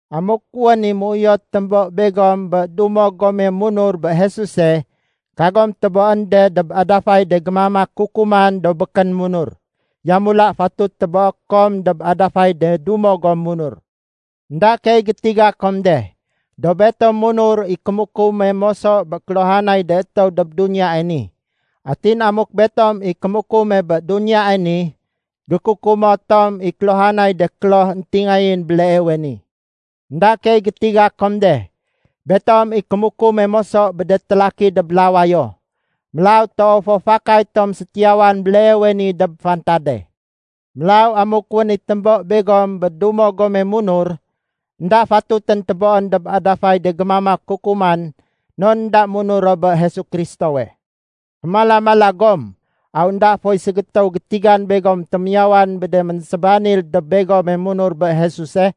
Amuk wén i méuyot témbo begom bé dumo gome munur bé Jesuse, kagom téboén de dob adafay de gémamak kukuman do békén munur. Yamula, fatut téboé kom dob adafay de dumo gom munur. Enda keey gétiga kom de, do betom munur i kémukume moso bé kéluhanay de étéw dob duniyae ni. Atin amuk betom i kémukume bé duniyae ni, gékukumo tom i kéluhanay de kloh éntingayén béleewe ni. Enda keey gétiga kom de, betom i kémukume moso bé de télaki dob lawayo. Mélaw toow fo fakay tom sétiyawan béleewe ni dob fantade. Mélaw amuk wén i témbo begom bé dumo gome munur, énda fatutén téboén dob adafay de gémamak kukuman non énda munur ro bé Jesu Kristowe. Fémala-mala gom! Aw énda foy ségétéw gétigan begom témiyawan bé de ménsébanil dob begome munur bé Jesuse?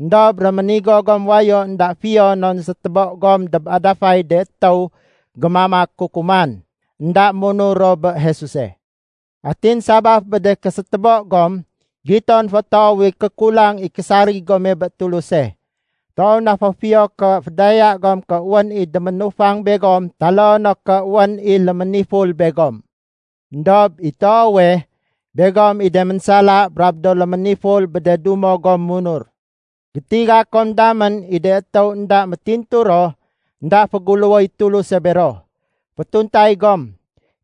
Endob réménigo gom wayo énda fiyo non sétébo gom dob adafay de étéw gémamak kukuman, énda munur ro bé Jesuse. Atin sabaf bé de késétébo gom, giton fo toow i kékulang i késarig gome bé Tuluse. Toow na fo fiyo ké fédaya gom ké wén i déménufang begom taloo no ké wén i léméniful begom. Endob i toowe, begom i de ménsala brab do léméniful bé de dumo gom munur. Gétiga kom damén i de étéw énda métintu ro, énda féguléwoy Tuluse bero. Fétuntay gom.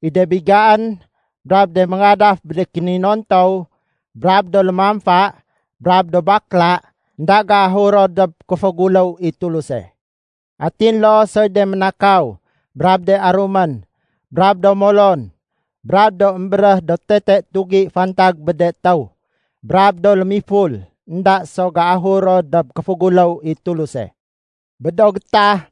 I de bigaén, brab de méngadaf bé de kéninontow, brab do lémamfa, brab do bakla, énda géahur ro dob kéféguléw i Tuluse. Atin loo soy de ménakaw, brab de arumén, brab do molon, brab do émbéréh do tete tugi fantag bé de étéw, brab do lémiful, énda so géahur ro dob kéféguléw i Tuluse. Bé do gétah,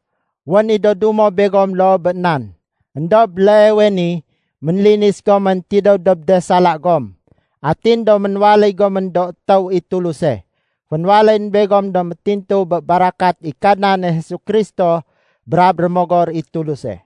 wén i do dumo begom loo bé nan. Endob béleewe ni ménlinis gomén tidéw dob de sala gom, atin do ménwaléy gomén do étéw i Tuluse. Fénwaléyén begom do métintu bé barakat i Kadnane Jesu Kristo brab Rémogor i Tuluse.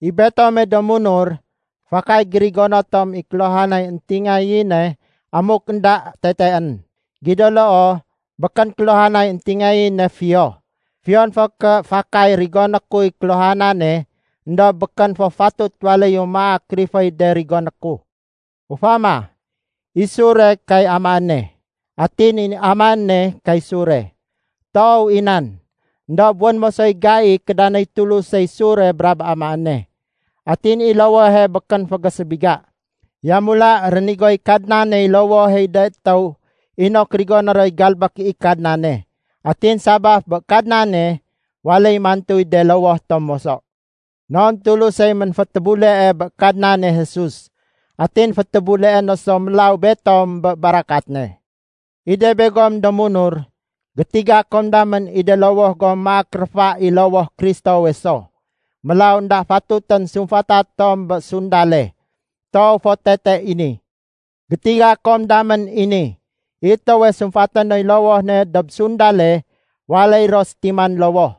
I betome do munur, fakay gérigono tom i kéluhanay éntingayéne amuk énda teteén. Gido loo, békén kéluhanay éntingayéne fiyo. Fiyon fo ké fakay rigoné kuy kéluhanane, éndob békén fo fatut waléyu maak riféy de rigoné ku. Ufama, i sure, kay amaéne. Atin i amaéne kay sure. Toow i nan. Endob wén moso i gai kédanéy Tulusey sure brab amaéne. Atin i lowohe békén fégésébiga. Yamula rénigoy Kadnaney lowoh i de étéw inok rigoné roy galbék i Kadnane. Atin sabaf bé Kadnane, waléy mantuy de lowoh tom moso. Non Tulusey ménfétébulee bé Kadnane Jesus, atin fétébuleé no so mélaw betom bé barakat ne. I de begom do munur, gétiga kom damén i de lowoh gom maak réfa i lowoh Kristowe so. Mélaw énda fatutén sumfata tom bé sundale. Toow fo tete i ni. Gétiga kom damén i ni. I étéwe sumfaté noy lowoh ne dob sundale, waléy ro sétiman lowoh.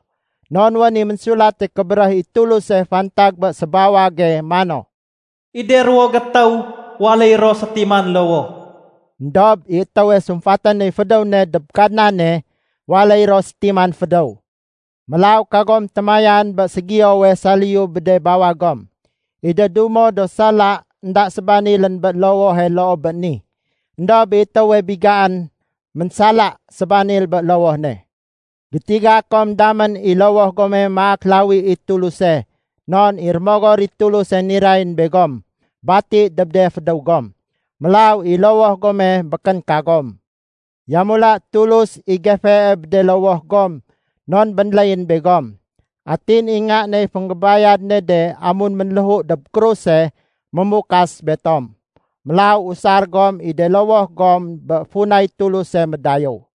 Non wén i Ménsulate Kébéréh i Tuluse fantag bé sébawage mano, “I de ruwo gétéw waléy ro sétiman lowoh.” Endob i étéwe sumfaté noy fédéw ne dob Kadnane waléy ro sétiman fédéw. Mélaw kagom témayan bé ségiyowe saliyu bé de bawag gom. I de dumo do sala énda sébanilén bé lowohe loo bé ni. Endob i étéwe bigaén, ménsala sébanil bé lowoh ne. Gétiga kom damén i lowoh gome maak lawi i Tuluse non i Rémogor i Tuluse nirayén begom, bati dob de fédéw gom. Mélaw i lowoh gome békén kagom. Yamula Tulus i gefee bé de lowoh gom non bénléyén begom, atin i Nga ney fénggébayad ne de amun ménléhu dob kruse mémukas betom. Mélaw usar gom i de lowoh gom bé funay Tuluse médayéw.